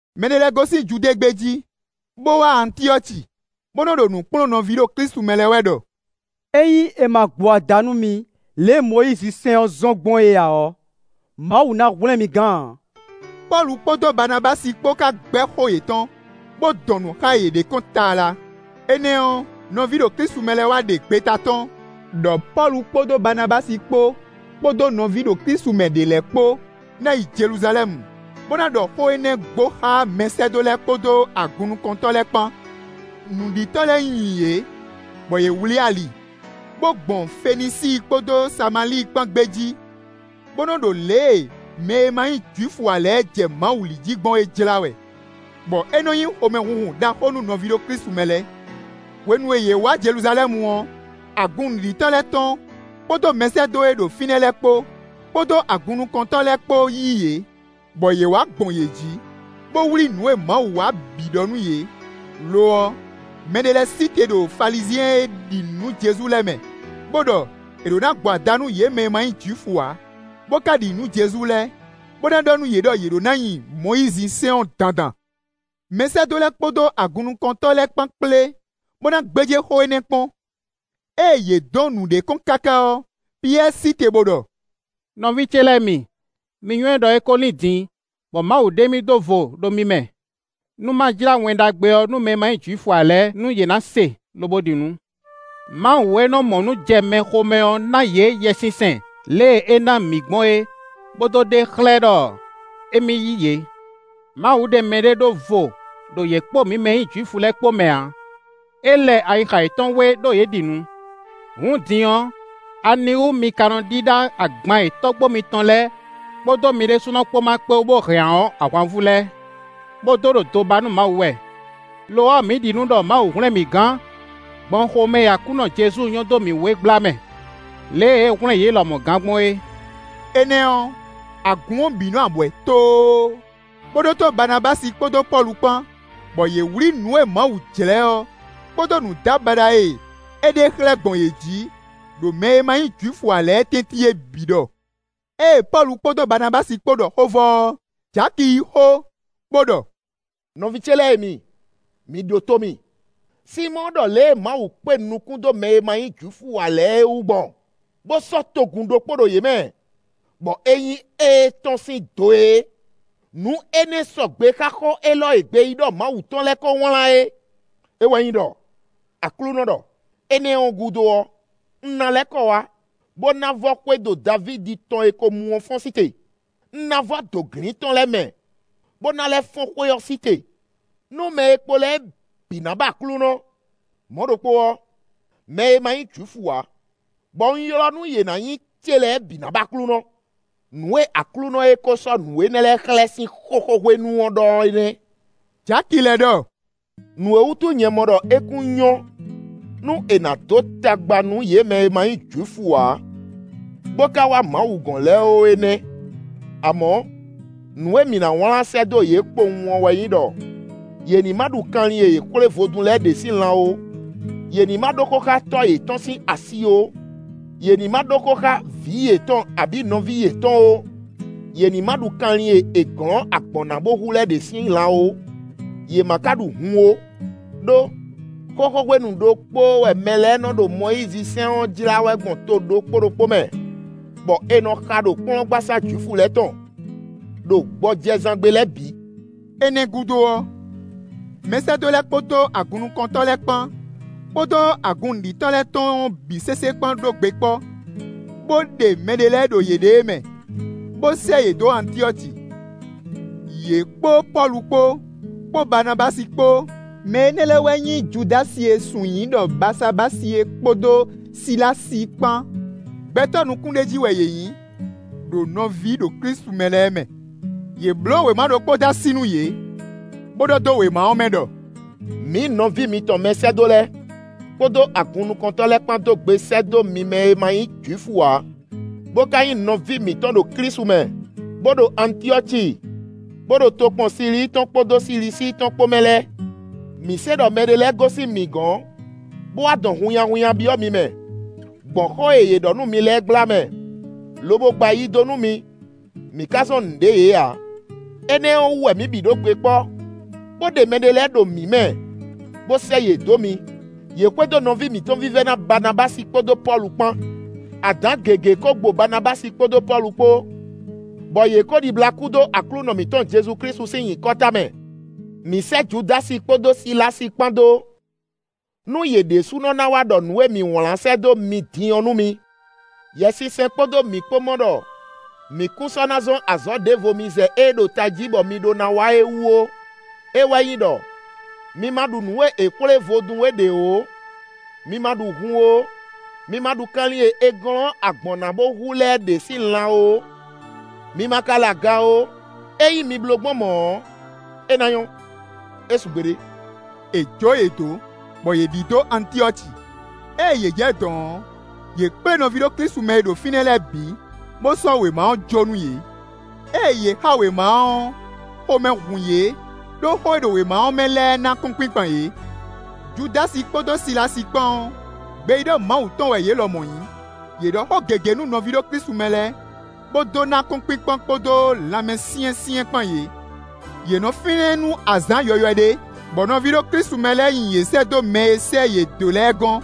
Mɛ ɖé lɛ́ɛ gosín Judée gbé jí, bó wá Antyɔ́ci, bó nɔ ɖo nǔ kplɔ́n nɔví ɖo Klísu mɛ lɛ́ɛ wɛ ɖɔ: “Ényí è ma gbo ada nú mi lě e Mɔyízi sɛ́n ɔ́ zɔ́n gbɔn é ǎ ɔ́, Mawu ná hwlɛ́n mi gán ǎ.” Pɔ́lu kpódó Baanabási kpó ka gbɛ́ xó yětɔn, bó dɔn nǔ xá yě ɖ'é kɔn tlala. Énɛ́ ɔ́, nɔví ɖo Klísu mɛ lɛ́ɛ wá ɖe gbeta tɔ́n, ɖɔ Pɔ́lu kpódó Baanabási kpó, kpódó nɔví ɖo Klísu mɛ ɖě lɛ́ɛ kpó ná yi Jeluzalɛ́mu bó ná ɖɔ xó énɛ́ gbo xá mɛsɛ́dó lɛ́ɛ kpódó agunnukɔntɔ́ lɛ́ɛ kpán. Nǔɖitɔ́ lɛ́ɛ nyi yě, bɔ yě wlǐ ali, bó gbɔn Fenisíi kpódó Samalíi kpán gbé jí bó nɔ́ ɖo lě e mɛ e ma nyí Jwifu ǎ lɛ́ɛ jɛ Mawu li jí gbɔn é jlá wɛ, bɔ é nɔ nyí xomɛhunhun ɖaxó nú nɔví ɖo Klísu mɛ lɛ́ɛ. Hwenu e yě wá Jeluzalɛ́mu ɔ́, agun nǔɖitɔ́ lɛ́ɛ tɔn, kpódó mɛsɛ́dó e ɖo fínɛ́ lɛ́ɛ kpó, kpódó agunnukɔntɔ́ lɛ́ɛ kpó yí yě, bɔ yě wá gbɔn yě jí, bó wlí nǔ e Mawu wa é bǐ ɖɔ nú yě; lo ɔ́, mɛɖé lɛ́ɛ sí te ɖo Falizyɛn e ɖi nǔ nú Jezu lɛ́ɛ mɛ, bó ɖɔ è ɖǒ ná gbo ada nú yě mɛ e ma nyí Jwifu ǎ, bó ka ɖi nǔ nú Jezu lɛ́ɛ, bó ná ɖɔ nú yě ɖɔ yě ɖǒ ná nyi Mɔyízisɛ́n ɔ́ dandan. Mɛsɛ́dó lɛ́ɛ kpódó agunnukɔntɔ́ lɛ́ɛ kpán kplé, bó ná gbéjé xó énɛ́ kpɔ́n. Ée yě dɔn nǔ ɖ'é kɔn káká ɔ́, Piyɛ́ɛ sí te bó ɖɔ: “Nɔví ce lɛ́ɛ mi, mi nywɛ́ ɖɔ é kó lín din, bɔ Mawu ɖe mì ɖó vo ɖo mi mɛ, nú ma jlá Wɛn Ɖagbe ɔ́ mɛ e ma nyí Jwifu ǎ lɛ́ɛ, nú yě ná se, lobo ɖi nǔ. Mawu e nɔ mɔ nǔ jɛ mɛ xomɛ ɔ́ ná yě Yɛsinsɛn lě e é ná mǐ gbɔn é, bó dó ɖe xlɛ́ ɖɔ émí yí yě. Mawu ɖe mɛɖé ɖó vo ɖo yě kpó mǐ mɛ e nyí Jwifu lɛ́ɛ kpó mɛ ǎ; é lɛ ayixa yětɔn wé ɖó yě ɖi nǔ. Hǔn din ɔ́, aniwú mi ka nɔ ɖíɖá agban e tɔ́gbó mitɔn lɛ́ɛ kpódó mi ɖésúnɔ kpó ma kpé wú bó hɛn ǎ ɔ́ ahwanvú lɛ́ɛ, bó dó ɖo do ba nú Mawu wɛ? Lo ɔ́, mǐ ɖi nǔ ɖɔ Mawu hwlɛ́n mǐ gán gbɔn xomɛ e Aklúnɔ Jezu nyɔ́ dó mǐ wú é gbla mɛ, lě e é hwlɛ́n yě lɔmɔ̌ gán gbɔn é.” Énɛ́ ɔ́, agun ɔ́ bǐ nɔ abwɛ̌ tóó, bó ɖótó Baanabási kpódó Pɔ́lu kpán, bɔ yě wlǐ nǔ e Mawu jlɛ́ ɔ́, kpódó nǔdábaɖa e é ɖe xlɛ́ gbɔn yě jí, ɖo mɛ e ma nyí Jwifu ǎ lɛ́ɛ tɛ́ntin é bǐ ɖɔ. Ée Pɔ́lu kpódó Baanabási kpó ɖɔ xó vɔ ɔ́, Jaki yí xó, bó ɖɔ: “Nɔví ce lɛ́ɛ e mi, mi ɖótó mì. Sinmɔ́ɔ ɖɔ lě e Mawu kpé nukún dó mɛ e ma nyí Jwifu ǎ lɛ́ɛ wú gbɔn, bó sɔ́ togun ɖokpó ɖo yě mɛ, bɔ é nyí étɔn sín do é; nǔ énɛ́ sɔgbe xá xó élɔ́ e gbeyíɖɔ Mawu tɔn lɛ́ɛ kó wlán é; é wɛ nyí ɖɔ: Aklúnɔ ɖɔ: ‘Énɛ́ ɔ́ gúdo ɔ́, un ná lɛ́ kɔ wá, bó ná vɔ́ xwédo Davídi tɔn e ko mu ɔ́ fɔ́n sí te; un ná vɔ́ dǒglin tɔn lɛ́ɛ mɛ, bó ná lɛ́ fɔ́n xwé ɔ́ sí te, nú mɛ e kpo lɛ́ɛ bǐ ná ba Aklúnɔ; mɔ̌ ɖokpó ɔ́, mɛ e ma nyí Jwifu ǎ, bɔ un ylɔ́ nú yě ná nyí ce lɛ́ɛ bǐ ná ba Aklúnɔ.’ Nǔ e Aklúnɔ e ko sɔ́ nǔ énɛ́ lɛ́ɛ xlɛ́ sín xóxó hwenu ɔ́ ɖɔ é nɛ́.” Jaki lɛ́ ɖɔ: “Nǔ é wútu nyɛ mɔ ɖɔ é kún nyɔ́ nú è nǎ dó tagba nú yě mɛ e ma nyí Jwifu ǎ, bó ka wá Mawu gɔ́n lɛ́ɛ ó é nɛ́. Amɔ̌, nǔ e mǐ ná wlán sɛ́ dó yě kpowun ɔ́ wɛ nyí ɖɔ: yě ní má ɖu kanlin e è xwlé vodún lɛ́ɛ ɖě sín lan ó; yě ní ma ɖó xó xá nɔ yětɔn ó, yě ní má ɖó xó xá tɔ́ yětɔn sín asi ó; yě ní má ɖó xó xá vǐ yětɔn abǐ nɔví yětɔn ó; yě má ɖu kanlin e è glɔ̌n agbɔ̌n ná bó hu lɛ́ɛ ɖě sín lan ó, yě ma ka ɖu hun ó. Đó, xóxó hwenu ɖokpóó wɛ mɛ lɛ́ɛ nɔ ɖo Mɔyízisɛ́n ɔ́ jlá wɛ gbɔn to ɖokpó ɖokpó mɛ, bɔ è nɔ xa ɖo kplɔ́ngbasá Jwifu lɛ́ɛ tɔn, ɖo gbɔjɛzán gbe lɛ́ɛ bǐ.” Énɛ́ gúdo ɔ́, mɛsɛ́dó lɛ́ɛ kpódó agunnukɔntɔ́ lɛ́ɛ kpán, kpódó agun nǔɖitɔ́ lɛ́ɛ tɔn ɔ́ bǐ sésé kpán ɖó gbe kpɔ́, bó ɖe mɛɖé lɛ́ɛ ɖo yěɖée mɛ, bó sɛ́ yě dó Antyɔ́ci, yě kpó Pɔ́lu kpó, kpó Baanabási kpó; mɛ énɛ́ lɛ́ɛ wɛ nyí Judási e è sun nyǐ ɖɔ Baasabási é kpódó Silási kpán; gbɛtɔ́ nukúnɖéjí wɛ yě nyǐ, ɖo nɔví ɖo Klísu mɛ lɛ́ɛ mɛ. Yě bló wěma ɖokpó dó así nú yě, bó ɖɔ dó wéma ɔ́ mɛ ɖɔ: “Mǐ nɔví mitɔn mɛsɛ́dó lɛ́ɛ, kpódó agunnukɔntɔ́ lɛ́ɛ kpán dó gbe sɛ́ dó mi mɛ e má nyí Jwifu ǎ, bó ka nyí nɔví mǐtɔn ɖo Klísu mɛ, bó ɖo Antyɔ́ci, bó ɖo tokpɔn Silíi tɔn kpódó Silisíi tɔn kpó mɛ lɛ́ɛ. Mǐ se ɖɔ mɛɖé lɛ́ɛ gosín mǐ gɔ̌n, bó wá dɔn hunnyahunnya byɔ́ mi mɛ, gbɔn xó e yě ɖɔ nú mi lɛ́ɛ gbla mɛ, lobo gba ayi dó nú mi; mǐ ká zɔ́n nǔɖé yě ǎ. Énɛ́ ɔ́ wú wɛ mǐ bǐ ɖó gbe kpɔ́, bó ɖe mɛɖé lɛ́ɛ ɖo mǐ mɛ, bó sɛ́ yě dó mi; yě xwedó nɔví mǐtɔn vívɛ́ná Baanabási kpódó Pɔ́lu kpán. Adǎn gěgé kó gbo Baanabási kpódó Pɔ́lu kpó, bɔ yě ko ɖibla kú dó Aklúnɔ mǐtɔn Jezu Klísu sín nyǐkɔ tamɛ. Mǐ sɛ́ Judási kpódó Silási kpán dó, nú yě ɖésúnɔ ná wá ɖɔ nǔ e mǐ wlán sɛ́ dó mi din ɔ́ nú mi. Yɛsinsɛn kpódó mǐ kpó mɔ ɖɔ mǐ kún sɔ́ ná zɔ́n azɔ̌ ɖěvo mi zɛ ée ɖo tají bɔ mi ɖó ná wa é wú ó; é wɛ nyí ɖɔ: mi ma ɖu nǔ e è xwlé vodún é ɖě ó; mi ma ɖu hun ó; mi ma ɖu kanlin e è glɔ̌n agbɔ̌n ná bó hu lɛ́ɛ ɖě sín lan ó; mi ma ka lɛ aga ó; ényí mi bló gbɔn mɔ̌ ɔ́, é ná nyɔ́. É su gbeɖé.” È jǒ yě dó, bɔ yě ɖidó Antyɔ́ci. Ée yě jɛ dɔ̌n ɔ́, yě kplé nɔví ɖo Klísu mɛ e ɖo fínɛ́ lɛ́ɛ bǐ, bó sɔ́ wěma ɔ́ jó nú yě. Ée yě xa wěma ɔ́, xomɛ hun yě, ɖó xó e ɖo wěma ɔ́ mɛ lɛ́ɛ ná akɔ́nkpinkpan yě. Judási kpódó Silási kpán ɔ́, gbeyíɖɔ Mawu tɔn wɛ yě lɔmɔ̌ nyǐ; yě ɖɔ xó gěgé nú nɔví ɖo Klísu mɛ lɛ́ɛ, bó dó ná akɔ́nkpinkpan kpódó lanmɛsyɛ́nsyɛ́n kpán yě. Yě nɔ fínɛ́ nú azǎn yɔywɛ ɖé, bɔ nɔví ɖo Klísu mɛ lɛ́ɛ nyi yě sɛ́ dó mɛ e sɛ́ yě dó lɛ́ɛ gɔ́n,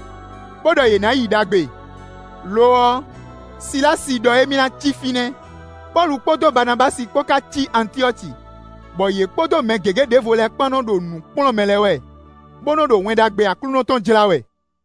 bó ɖɔ yě na yi ɖagbe. [ Lo ɔ́, Silási ɖɔ émí ná cí fínɛ́.] Pɔ́lu kpódó Baanabási kpó ka cí Antyɔ́ci, bɔ yě kpódó mɛ gěgé ɖěvo lɛ́ɛ kpán nɔ ɖo nǔ kplɔ́n mɛ lɛ́ɛ wɛ, bó nɔ́ ɖo Wɛn Ɖagbe Aklúnɔ tɔn jlá wɛ.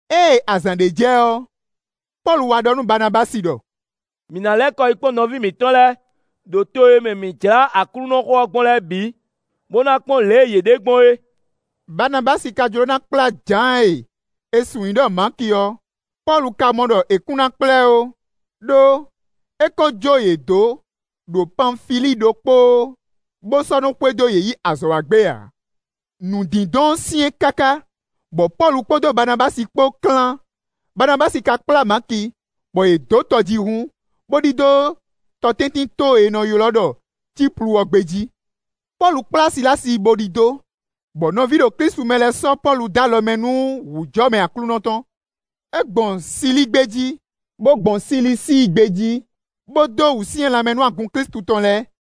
Ée azǎn ɖé jɛ ɔ́, Pɔ́lu wá ɖɔ nú Baanabási ɖɔ: “Mǐ ná lɛ́ kɔ yi kpɔ́n nɔví mǐtɔn lɛ́ɛ ɖo to e mɛ mǐ jlá Aklúnɔxó ɔ́ gbɔn lɛ́ɛ bǐ, bó ná kpɔ́n lě e yě ɖe gbɔn é.” Baanabási ka jló ná kplá Jǎan e è sun nyǐ ɖɔ Maki ɔ́; Pɔ́lu ka mɔ ɖɔ è kún ná kplá ɛ ó, ɖó é ko jó yě dó ɖo Panfilíi ɖokpóó, bó sɔ́ nɔ́ xwedó yě yi azɔ̌ wa gbé ǎ. Nǔ dindɔn ɔ́ syɛ́n káká, bɔ Pɔ́lu kpódó Baanabási kpó klán. Baanabási ka kplá Maki, bɔ yě dó tɔjíhún, bó ɖidó tɔtɛ́ntinto e è nɔ ylɔ́ ɖɔ Cíplu ɔ́ gbé jí. Pɔ́lu kplá Silási bo ɖidó, bɔ nɔví ɖo Klísu mɛ lɛ́ɛ sɔ́ Pɔ́lu dó alɔ mɛ nú wǔjɔmɛ Aklúnɔ tɔn. É gbɔn Silíi gbé jí, bó gbɔn Silisíi gbé jí, bó dó wǔsyɛ́n lanmɛ nú agun Klísu tɔn lɛ́ɛ.